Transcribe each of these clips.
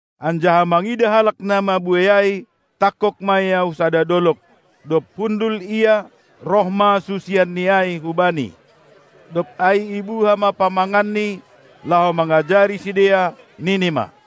Anjaha mangidah halak na mabuei ai, tangkog ma Ia hu sada dolog; dob hundul Ia, roh ma susianNi ai hu-Bani. Dob ai ibuha ma pamanganNi, laho mangajari sidea, nini ma: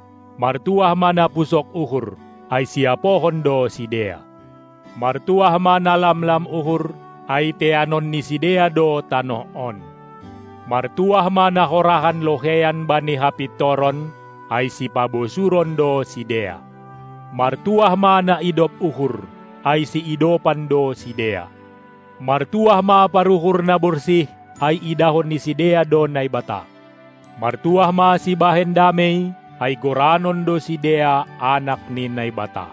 Martuah ma na pusok uhur, ai siapohon do sidea! Martuah ma na lamlam uhur, ai teanon ni sidea do tanoh on! Martuah ma na horahan loheian bani hapintoron, ai sipabosuron do sidea. Martuah ma na idop uhur, ai siidopan do sidea. Martuah ma paruhur na borsih, ai idahon ni sidea do Naibata! Martuah ma sibahen damei, ai goranon do sidea anak ni Naibata!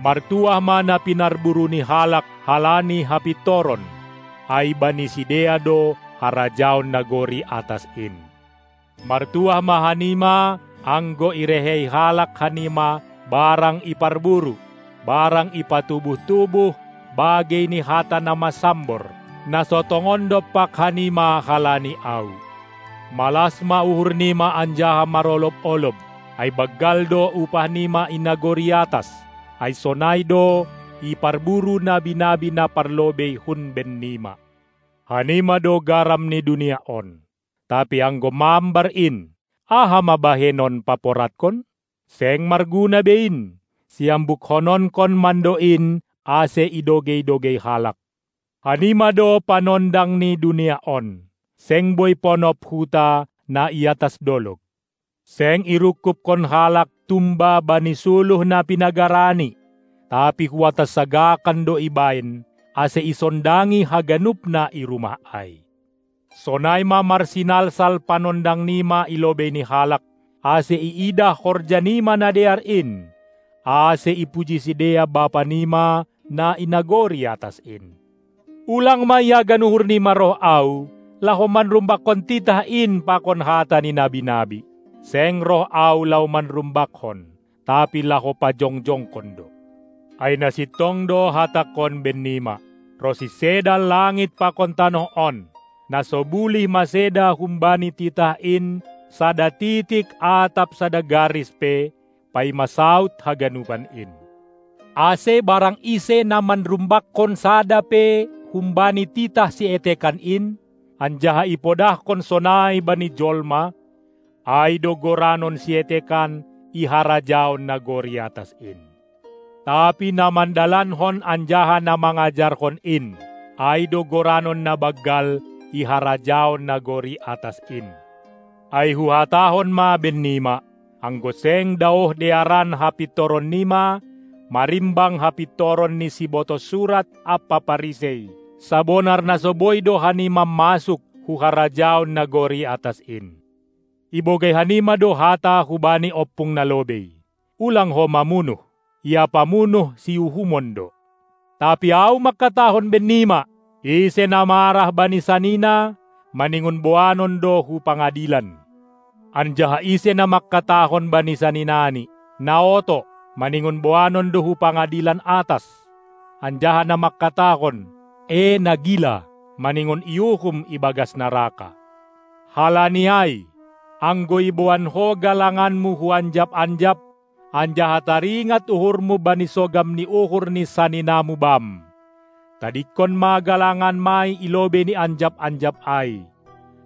Martuah ma na pinarburu ni halak halani hapintoron, ai bani sidea do harajaon nagori atas in! Martuah ma hanima anggo irehei halak hanima barang iparburu, barang ipatubuh-tubuh bagei ni hata na masambor, na so tongon dompak hanima halani Ahu! Malas ma uhurnima anjaha marolob-olob, ai banggal do upahnima i nagori atas, ai sonai do iparburu nabi-nabi na parlobei hun bennima. Hanima do garam ni dunia on! Tapi anggo mambar in, aha ma bahenon paporadkon? Seng marguna be in, siambukkononkon mando in ase idogei-dogei halak. Hanima do panondang ni dunia on! Seng boi ponop huta na i atas dolog. Seng irungkubhon halak tumba bani suluh na pinagarani, tapi hu atas sagakan do ibahen, ase isondangi haganup na i rumah ai. Sonai ma marsinalsal panondangnima i lobei ni halak, ase iidah horjanima na dear in, ase ipuji sidea Bapanima na i nagori atas in. Ulang ma iagan uhurnima roh Ahu, laho manrumbakkon titah in pakon hata ni nabi-nabi; seng roh Ahu laho manrumbakkon, tapi laho pajongjongkon do. Ai na sintong do Hatangkon bennima: Ronsi seda langit pakon tanoh on, na so bulih maseda humbani titah in sada titik atap sada garis pe, paima saud haganupan in. Ase barang ise na manrumbakkon sada pe humbani titah sietekan in, anjaha ipodahkon sonai bani jolma, ai do goranon sietekan i harajaon nagori atas in; tapi na mandalankon anjaha na mangajarhon in, ai do goranon na banggal i harajaon nagori atas in. Ai Huhatahon ma bennima: Anggo seng daoh dearan hapintoronnima marimbang hapintoron ni Sibotoh Surat ampa Parisei, sabonar na so boi do hanima masuk hu harajaon nagori atas in. Ibogei hanima do hata hubani ompung nalobei: Ulang ho mamunuh! Ia pamunuh siuhumon do. Tapi Ahu mangkatahon bennima: Ise na marah bani sanina, maningon boanon do hu pangadilan. Anjaha ise na mangkatahon bani saninani "na oto", maningon boanon do hu pangadilan atas, anjaha na mangkatahon "e na gila", maningon iuhum ibagas naraka. Halani ai, anggo iboan ho galanganmu hu anjap-anjap, anjaha taringat uhurmu bani sogam ni uhur ni saninamu bam, tadingkon ma galanganmai i lobei ni anjap-anjap ai,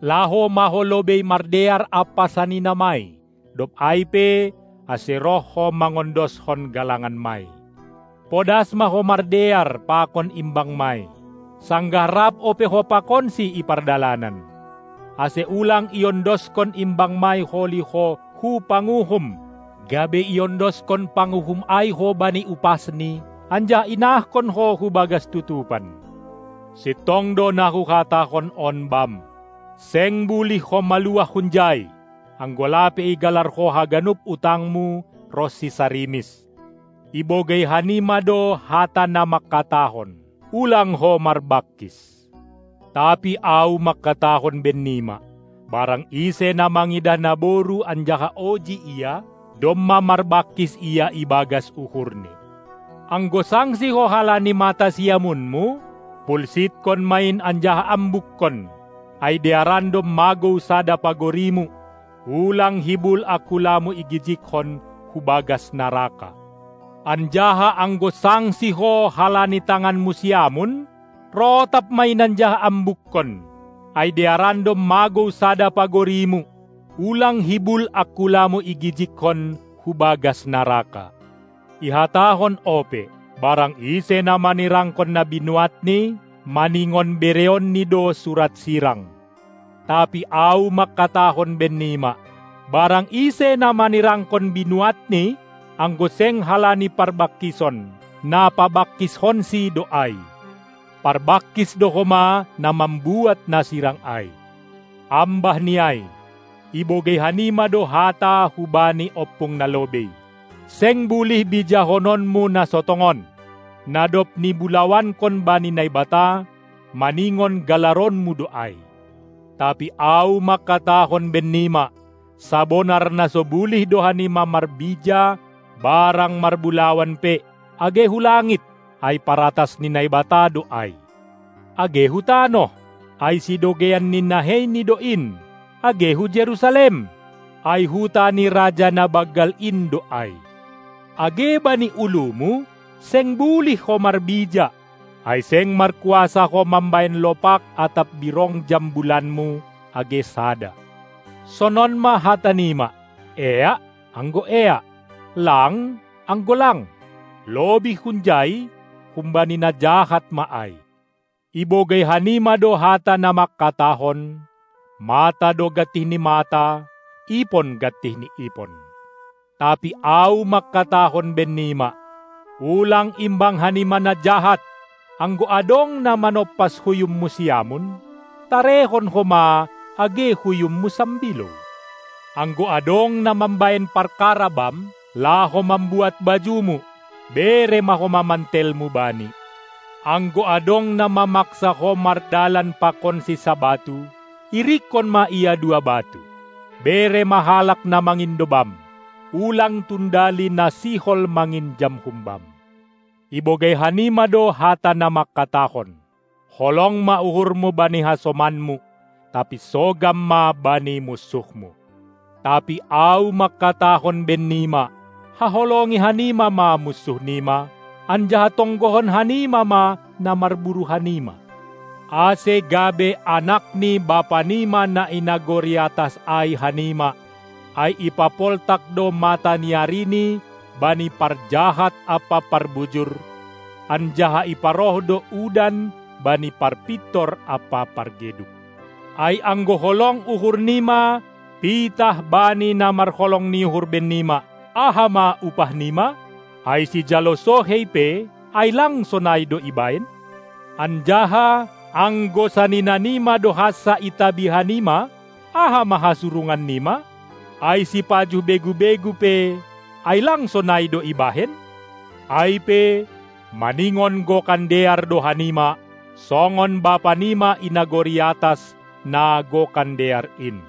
laho ma ho lobei mardear ampa saninamai, dob ai pe ase roh ho mangondoskon galanganmai! Podas ma ho mardear pakon imbangmai, sanggah rap ope ho pakonsi i pardalanan, ase ulang iondoskon imbangmai holi ho hu panguhum, gabe iondoskon panguhum ai ho bani upasni, anjaha inahkon ho hu bagas tutupan. Sintong do na Huhatahon on bam: Seng bulih ho maluah hunjai, anggo lape igalar ho haganup utangmu, ronsi sarimis. Ibogei hanima do hata na mangkatahon: Ulang ho marbangkis! Tapi Ahu mangkatahon bennima: Barang ise na mangidah naboru anjaha oji ia, domma marbangkis ia ibagas uhurni. Anggo sangsi ho halani mata siamunmu, pulsitkon ma in anjaha ambukkon, ai dearan do magou sada pagorimu, ulang hibul angkulamu igijigkon hu bagas naraka. Anjaha anggo sangsi ho halani tanganmu siamun, rotap ma in anjaha ambukkon, ai dearan do magou sada pagorimu, ulang hibul angkulamu igijigkon hu bagas naraka. Ihatahon ope: Barang ise na manirangkon na binuatni, maningon bereonni do surat sirang. Tapi Ahu mangkatahon bennima: Barang ise na manirangkon binuatni, anggo seng halani parbangkison, na pabangkishonsi do ai. Parbangkis do homa na mambuat na sirang ai. Ambah ni ai, ibogei hanima do hata hubani ompung nalobei: Seng bulih bijahononmu na so tongon! Na dob nibulawankon bani Naibata, maningon galaronmu do ai! Tapi Ahu mangkatahon bennima: Sabonar na so bulih do hanima marbija barang marbulawan pe, age hu langit, ai paratas ni Naibata do ai; age hu tanoh, ai sidogeian ni naheiNi do in, age hu Jerusalem, ai huta ni Raja na banggal in do ai. Age bani ulumu seng bulih ho marbija, ai seng markuasa ho mambahen lopak atap birong jambulanmu age sada. Sonon ma hatanima: Eak, anggo eak, lang, anggo lang. Lobih hunjai, humbani na jahat ma ai. Ibogei hanima do hata na mangkatahon: Mata do gantih ni mata, ipon gantih ni ipon. Tapi Ahu mangkatahon bennima: Ulang imbang hanima na jahat! Anggo adong na manompas huyummu siamun, tarehon homa age huyummu sambilou! Anggo adong na mambahen parkara bam, laho mambuat bajumu, bere ma homa mantelmu bani! Anggo adong na mamaksa ho mardalan pakonsi sabatu, irikkon ma ia dua batu. Bere ma halak na mangindo bam! Ulang tundali na sihol manginjam humbam! Ibogei hanima do hata na mangkatahon: Holong ma uhurmu bani hasomanmu, tapi sogam ma bani munsuhmu! Tapi Ahu mangkatahon bennima: Haholongi hanima ma munsuhnima, anjaha tonggohon hanima ma na marburu hanima, ase gabe anak ni Bapanima na i nagori atas ai hanima, ai ipapoltak do mataniariNi bani parjahat ampa parbujur, anjaha iparoh do udan bani parpintor ampa pargeduk. Ai anggo holong uhurnima pitah bani na marholong ni uhur bennima, aha ma upahnima? Ai sijalo sohei pe, ai lang sonai do ibahen? Anjaha anggo saninanima do hansa itabi hanima, aha ma hasurungannima? Ai sipajuh begu-begu pe, ai lang sonai do ibahen? Ai pe, maningon gokan dear do hanima, songon Bapanima i nagori atas, na Gokan Dear in!